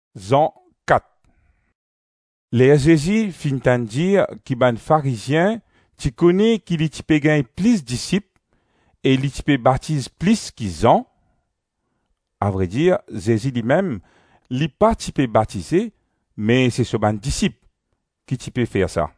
Zezi zwenn enn Samaritenn. Ler Zezi finn tann dir ki bann Farizien ti kone ki li ti pe gagn plis disip e li ti pe batiz plis ki Zan, (avredir, Zezi limem, li pa ti pe batize me se so bann disip ki ti pe fer sa)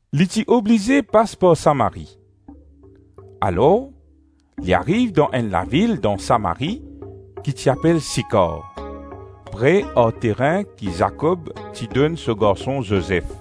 Li ti oblize pas par Samari. Alors li ariv dan enn lavil dan Samari ki ti apel Sikar, pre ar terin ki Zakob ti donn so garson Zozef.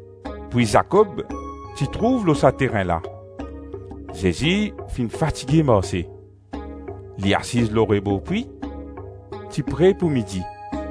Pwi Zakob ti trouv lor sa terin la; Zezi finn fatige marse; li asiz lor rebor pwi; ti pre pou midi.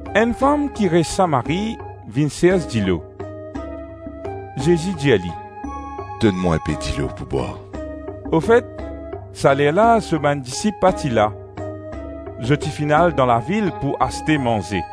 Enn fam ki res Samari vinn sers dilo. Zezi dir li, “Donn mwa inpe dilo pou bwar.” Ofet sa lerla so bann disip pa ti la; zot ti finn al dan lavil pou aste manze.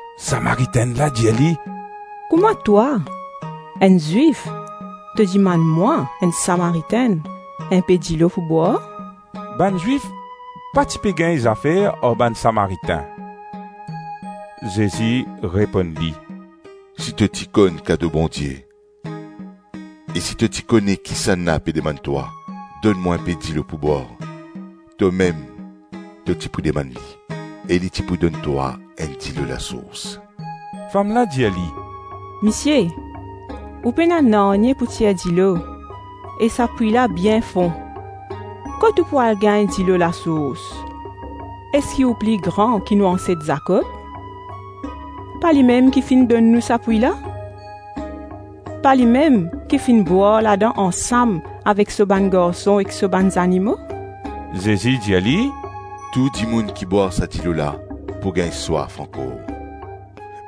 Samaritenn la dir li, “Kouma twa, enn Zwif, to dimann mwa, enn Samaritenn, inpe dilo pou bwar?” Bann Zwif pa ti pe gagn zafer ar bann Samaritin. Zezi reponn li, “Si to ti konn kado Bondie e si to ti kone kisannla pe demann twa, donn mwa inpe dilo pou bwar, tomem to ti pou demann li, e li ti pou donn twa enn dilo lasours.” Fam la dir li, “Misie, ou pena nanye pou tir dilo, e sa pwi la bien fon, kot ou pou al gagn dilo lasours? Eski ou pli gran ki nou anset Zakob? Pa limem ki finn donn nou sa pwi la? Pa limem ki finn bwar ladan ansam avek so bann garson ek so bann zanimo?” Zezi dir li, “Tou dimoun ki bwar sa dilo la pou gagn swaf ankor,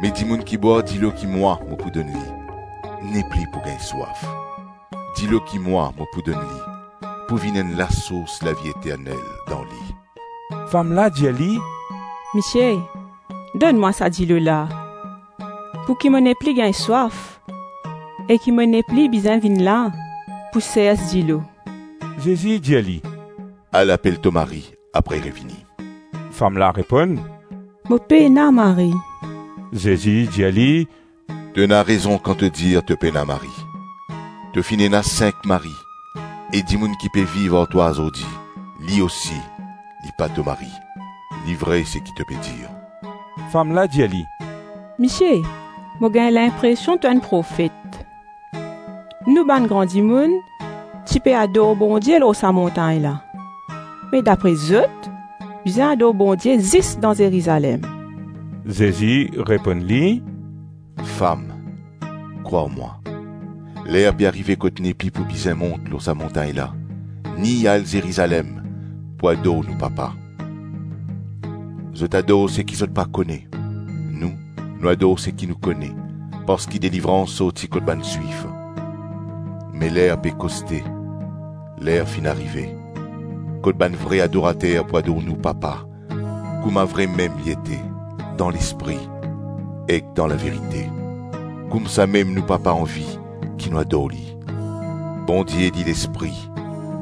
Me dimoun ki bwar dilo ki mwa mo pou donn li, nepli pou gagn swaf; dilo ki mwa mo pou donn li, pou vinn enn lasours lavi eternel dan li.” Fam la dir li, “Misie, donn mwa sa dilo la, pouki mo nepli gagn swaf e ki mo nepli bizin vinn la pou sers dilo.” Zezi dir li, “Al apel to mari apre revini.” Fam la reponn, “Mo pena mari.” Zezi dir li, “To ena rezon kan to dir to pena mari. To finn ena sink mari e dimoun ki pe viv ar twa azordi, li osi, li pa to mari; li vre seki to pe dir.” Fam la dir li, “Misie, mo gagn linpresion to enn profet. Nou bann gran dimoun ti pe ador Bondie lor sa montagn la; me dapre zot, bizin ador Bondie zis dan Zerizalem.” Zezi reponn li, “Fam, krwar mwa, ler pe arive kot nepli pou bizin mont lor sa montagn la, ni al Zerizalem pou ador nou Papa. Zot ador seki zot pa kone, nou, nou ador seki nou kone, parski delivrans sorti kot bann Zwif. Me ler pe koste, ler finn arive, kot bann vre adorater pou ador nou Papa kouma vremem li ete, dan Lespri ek dan laverite. Koumsamem nou Papa anvi ki nou ador Li. Bondie li Lespri;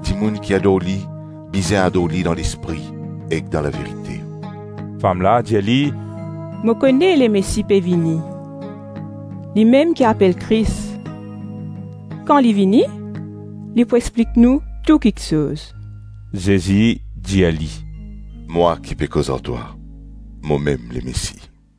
dimoun ki ador li, bizin ador li dan Lespri ek dan laverite.” Fam la dir li, “Mo kone Lemesi pe vini, limem ki apel Kris. Kan li vini, li pou explik nou tou kiksoz.” Zezi dir li, “Mwa ki pe koz ar twa, momem Lemesi.”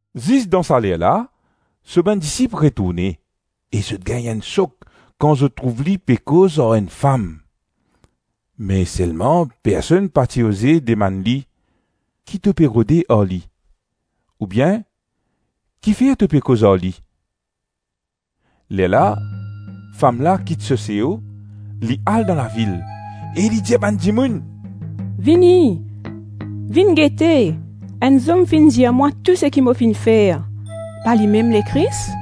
Zis dan sa lerla, so bann disip retourne e zot gagn enn sok kan zot trouv li pe koz ar enn fam; me selman personn pa ti oze demann li, “Ki to pe rode ar li?” ou bien “Kifer to pe koz ar li?” Lerla fam la kit so seo, li al dan lavil e li dir bann dimoun, “Vini, vinn gete; enn zom finn dir mwa tou seki mo finn fer; pa limem Lekris?”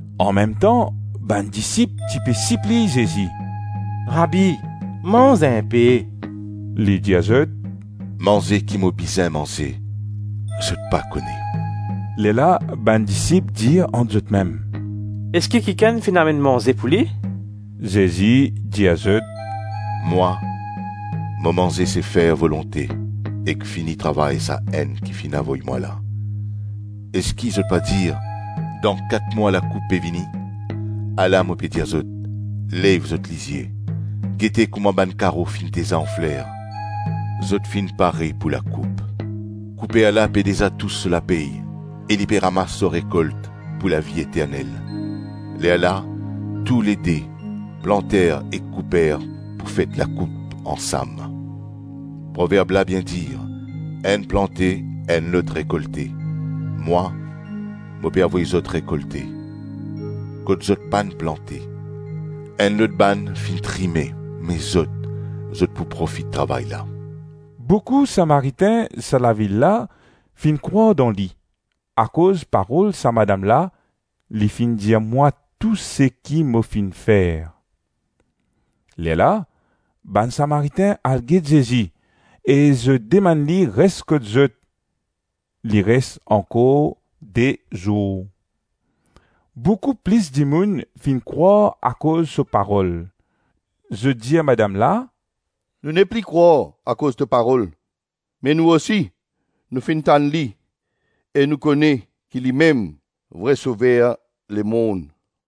Anmemtan, bann disip ti pe sipliy Zezi, “Rabi manz inpe.” Li dir zot, “Manze ki mo bizin manze, zot pa kone.” Lerla bann disip dir ant zotmem, “Eski kikenn finn amenn manze pou li?” Zezi dir zot, “Mwa, mo manze, se fer volonte ek fini travay Sa-Enn ki finn avoy mwa la. Eski zot pa dir, ‘Dan kat mwa, lakoup pe vini?’ Ala mo pe dir zot, lev zot lizie, gete kouma bann karo finn deza anfler, zo finn pare pou lakoup. Kouper la pe deza tous so lapey e li pe ramas so rekolt pou lavi eternel; lerla, toulede, planter ek kouper pou fet lakoup ansam. Proverb la bien dir, enn plante, enn lot rekolte. Mwa, mo pe avoy zot rekolte, kot zot pann plante; enn lot bann finn trime me zot, zot pou profit travay la.” Boukou Samaritin sa lavil la finn krwar dan li, akoz parol sa madam la, ‘li finn dir mwa tou seki mo finn fer.’ Lerla bann Samaritin al get Zezi e zot demann li res kot zot; li res ankor de zour. Boukou plis dimoun finn krwar akoz so parol. Zot dir madam la, “Nou nepli krwar akoz to parol, me nou osi, nou finn tann li e nou kone ki limem vre Sover lemonn.”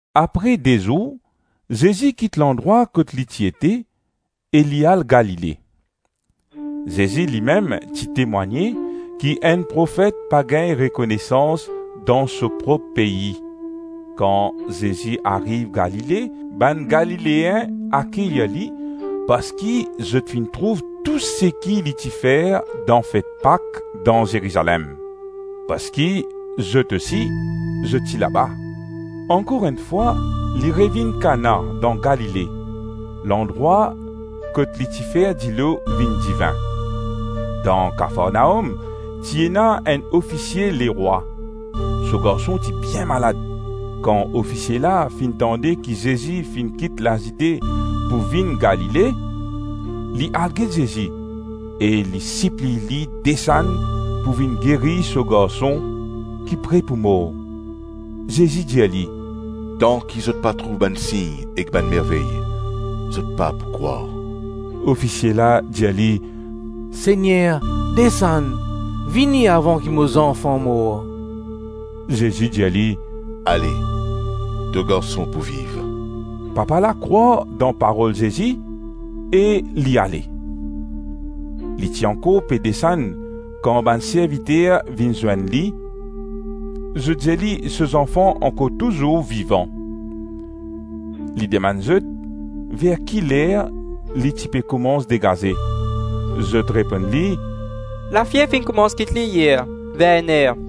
Apre de zour, Zezi kit landrwa kot li ti ete e li al Galile. Zezi limem ti temwagne ki enn profet pa gagn rekonesans dan so prop pei. Kan Zezi ariv Galile, bann Galileen akeyir li parski zot finn trouv tou seki li ti fer dan fet Pak dan Zerizalem; parski zot ousi zot ti laba. Ankor enn fwa, li revinn Kana dan Galile, landrwa kot li ti fer dilo vinn divin. Dan Kafarnaom, ti ena enn ofisie lerwa; so garson ti bien malad. Kan ofisie la finn tande ki Zezi finn kit Lazide pou vinn Galile, li al get Zezi e li sipliy li desann pou vinn geri so garson ki pre pou mor. Zezi dir li, “Tanki zot pa trouv bann sign ek bann mervey, zot pa pou krwar.” Ofisie la dir li, “Segner, desann, vini avan ki mo zanfan mor.” Zezi dir li, “Ale, to garson pou viv.” Papa la krwar dan parol Zezi e li ale. Li ti ankor pe desann kan bann serviter vinn zwenn li; zot dir li so zanfan ankor touzour vivan. Li demann zot ver ki ler li ti pe koumans degaze, zot reponn li, “Lafiev finn koumans kit li yer, ver enn-er.”